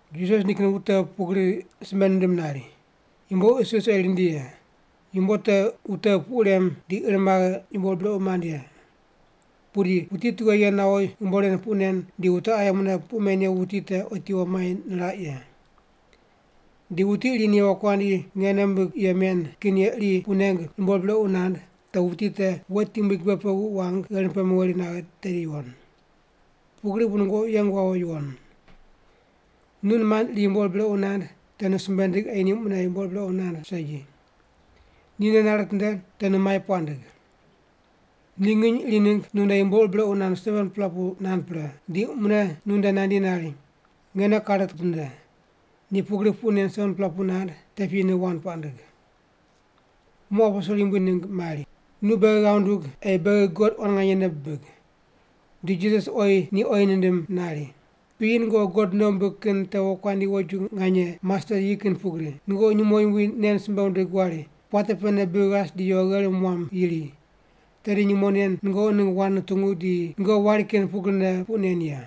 Jisas nikin wute pugri simbe nindim nari, “Yumbo isis ei rindi ye. Yumbo te wute puq rem di ir maghe yumbo ur brequ mand ye. Pudi wuti tughe ye nawo yumbo ren puq nen di wute aye mune puq men ye wuti te otiwo mai niraq ye. Di wuti iri ni wokuandi nge nei mimbigh ye men kin ye iri puq neng yumbo ur brequ nand, te wuti te wet yumbui gibe pe wuq wang gherim pe meweri naghe tedi yuwon. Pugri bu nungoqi yeng wawo yuwon. “Nu nimand iri yumbo ur brequ nand, te nu simbe ndig ei ni mune yumbo ur brequ nand segi. Ni nei nare nitinde, te nu mai puaq ndig. Ni nginy iri ningg nu nde yumbo ur brequ nand 7-pela pu nand pre, di mune nunde nandi nari, ‘Nge nei kare kitinde.’ Ni pugri puq nen 7-pela pu nand, te piyi nu wand puaq ndig.” Muq aposel Yumbui ningg mari, “Nu beghi ghav ndug ei beghi God quan nganye nei bidig.” Di Jisas oyi ni oyi nindim nari, “Piyi nungoqi God nei wumbig kin te wokuandi woju nganye mastet yi kin pugri, nungoqi nyumo yumbui nen simbe wundig wari, ‘Puate pene bri ghas di yo gherim wam yiri.’ Tedi nyumo nen nungoqi ningg wand nutungu di nungoqi wari kin pugrine puq nen ye.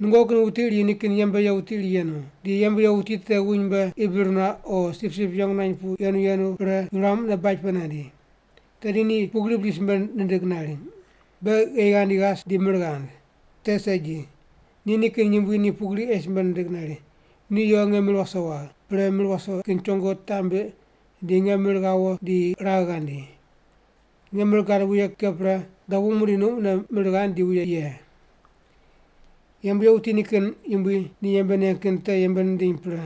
“Nungoqi kin wuti iri nikin yembe ye wuti iri yenu. Di yembe ye wuti te wuny mbe qi bir nuaq o sipsip yeng nuany pu yenu yenu pre, yuram mune baj pe nandi. Tedi ni pugri bri simbe nindig nari, ‘Be gheyi ghandi ghas di mir ghand’? Te segi. Ni nikin yumbui ni pugri ei simbe nindig nari, ‘Nu yo nge mir wase wagh, pre mir wase kin chongo taq mbiq di nge mir ghawo di ragh ghandi. Nge mir gad wuye ke pre, dobu muqdi nu mune mir ghand di wuye ye.’ Yembe ye wuti nikin yumbui ni yembe neng kin te yembe nindiny pre.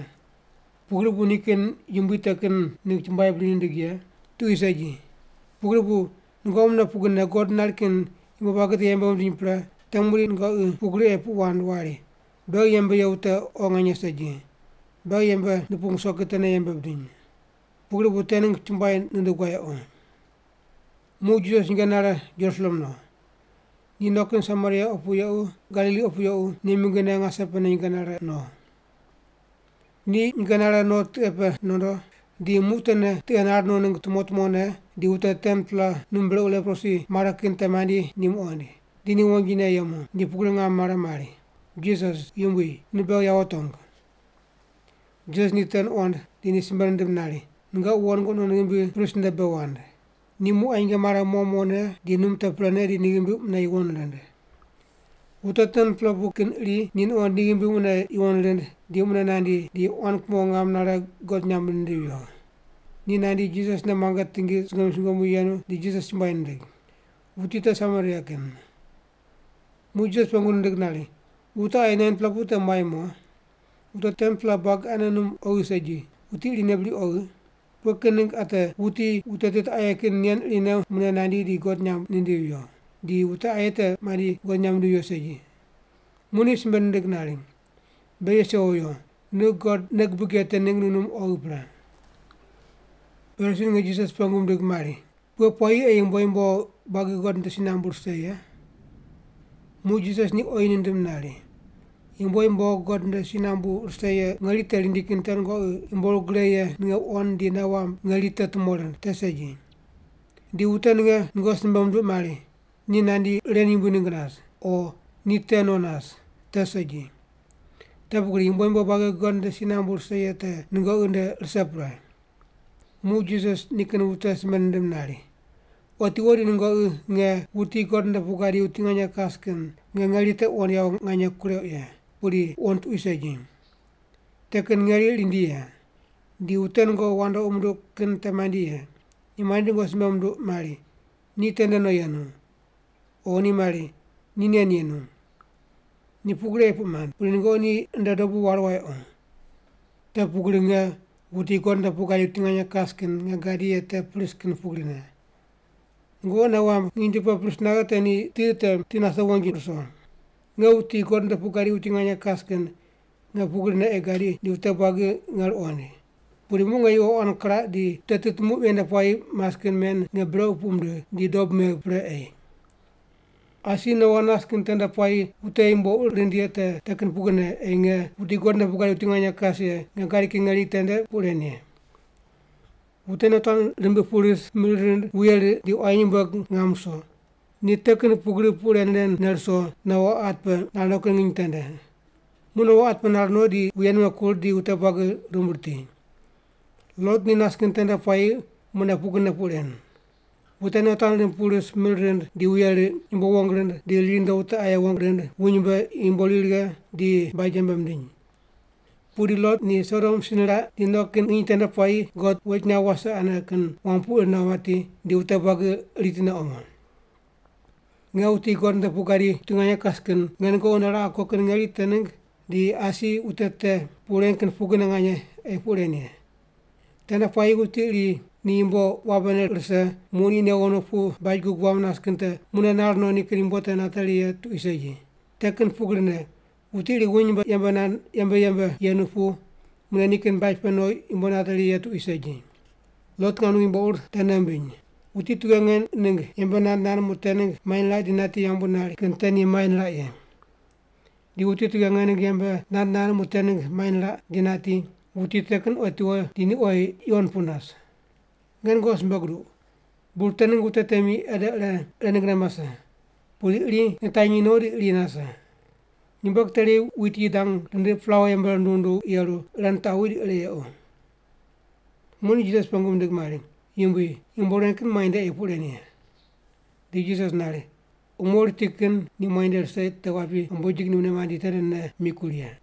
Pugri bu nikin yumbui te kin ningg chumbuai bri nindig ye? Tuqui segi. Pugri bu nungoqi mune pugrine God nari kin yumbo buagi te yembe wundiny pre, te muqdi nungoqi pugri ei puq wand wari, ‘Beghi yembe ye wute oghi nganye segi, beghi yembe nupung ruso kin tene yembe bidiny. Pugri bu te ningg chumbuai nundug wayequ’.” Muq Jisas nyinge nare Jerusalem no. Ni no kin Samaria opu yequ Galili opu yequ ni mingine ngase pene nyinge nare no. Ni nyinge nare no tiqe pe nondo, di muq tene tiqe nar no ningg tumo tumone di wute 10-pela num brequ leprosi mare kin te mandi ni muqoind. Di ni wonjine yemu, di pugri ngam mare mari, “Jisas, Yumbui, nu beghi yawo tongu!” Jisas ni te nuqond di ni simbe nindim nari, “Nungoqi wo nungoqi non ghimbi prist nde bei wand.” Ni muq qa nyinge mare mo mone di num te prene di ni ghimbi mune yuwon rind. Wute 10-pela te kin iri ni nuqond ni ghimbi mune yuwon rind di mune nandi, di quan kumo ngam nare God nyamb nindivi viyo. Ni nandi, Jisas nde muange tingi sungomyu sungomyu yenu di Jisas chumbuai nindig. Wuti te Samaria kin. Muq Jisas pengu nand nari, “Wute aye 9-pela te muai mo? Wute 10-pela buagi anene num oghi segi, wuti irine bri oghi? Pughe kin ningg ate wuti wute tit aye kin nen irine mune nandi di God nyamb nindivi viyo, di wute aye te mandi God nyamb mindivi viyo segi?” Muq ni simbe nindig nari, “Be yes yewo yo. Nu God nei gubig ye te ningg nu num te oghi pre.” Parisi ninge Jisas pengu mindig mari, “Pughe puayi ei yumbo yumbo buagi God nde si nambu rise ye?” Muq Jisas ni oyi nindim nari, “Yumbo yumbo God nde si nambu rise ye ngeri te rindi kin te nungoqi yumbo ur gre ye ninge wuqond di nei wamb ngeri te tumo rind, te segi. Di wute ninge nungoqi simbe munduq mari, ‘Ni nandi ren yumbui ningg nas,’ o ‘Ni te no nas,’ te segi. Te pugri yumbo yumbo buagi God nde si nambu rise ye te nungoqi nde rise pre.” Muq Jisas nikin wute simbe nindim nari, “Otiwo di nungoqi nge, wuti God nde pu gadi wuti nganye kas kin, nge ngeri te wuqond yawo nganye kureuq ye, pudi wuqond tuqui segi. Te kin ngeri rindi ye. Di wute nungoqi wandoqi munduq kin te mandi ye. Ni mandi di nungoqi simbe munduq mari, ‘Ni tende no yenu,’ o mari, ‘Ni nen yenu.’ Ni pugri ei puq mand, pudi nungoqi ni nde dobu waru wayequ. Te pugri nge, wuti God nde pu gadi wuti nganye kas kin, nge gadi ye te pris kin pugrine. Nungoqi nei wamb nginy tu pe pris naghe te ni ti te ti nase wonji ruso. Nge, wuti God nde pu gadi wuti nganye kas kin, nge pugrine ei gadi di wute buagi nge ruqoind. Pudi muq nge yuqo quan kiraq di wute tit muq ven nde puayi mas kin men nge brequ puq mindigh, di dob megh pre ei. “Asi Noa nas kin tende puayi wute yumbo ur rind ye te kin pugrine ei nge, wuti God nde pu gadi wuti nganye kas ye, nge gadi kin ngeri tende puq ren ye. Wute nei tuan rimbiq pu ris, mir rind, di wuye riq, di quayi nyumbueg ngam ruso. Ni te kin pugri puq ren ren ne ruso, Noa at pe nar no kin nginy tende. Muq Noa at pe nar no di wuye nime kur di wute buagi rumb riti. “Lot ni nas kin tende puayi mune wute pugrine puq ren. Wute nei tuan rimb pu ris mir rind di wuye riq, yumbo wong rind di ri rundo wute aye wong rind, wuny mbe yumbo ri righe di baj yembe mindiny. Pudi Lot ni Sodom si niraq di no kin nginy tende puayi God wet nyaw wase ane kin wam pu ir nawo mati, di wute buagi ritine omo. “Nge, wuti God nde pu gadi wuti nganye kas kin, nge nungoqi nde raqe ko kin ngeri te ningg di asi wute te puq ren kin pugrine nganye ei puq ren ye. Tende puayi wuti iri ni yumbo wabene rise muq ni newo no pu baj wam nas kin te mune nar no nikin yumbo te nateri ye tuqui segi. Te kin pugrine, wuti iri wuny mbe yembe yembe yenu pu mune nikin baj pe no yumbo nateri ye tuqui segi. Lot ngam ningg yumbo ur te nei wumbiny. Wuti tughe nge ningg yembe nand nand muq te ningg mai niraq di nati yambu nari kin te ni mai niraq ye. Di wuti tughe nge ningg yembe nand nand muq te ningg mai niraq di nati, wuti te kin otiwo di ni oyi yuwon pu nas. Nge nungoqi simbe guduq, bur te ningg wute temi ede ire ninggne mase, pudi iri nitanyi no di iri nase. Nyumbueg teri wit yi dang rindiq plaua yembe runduw runduw yeru ire nitaqwi di ire yequ.” Muq ni Jisas pengu mindig mari, “Yumbui, yumbo ren kin muainde ei puq ren ye?” Di Jisas nari, “Umo riti kin ni muainde rise te wapi ambojig ni mune mandi tendene mikur ye.”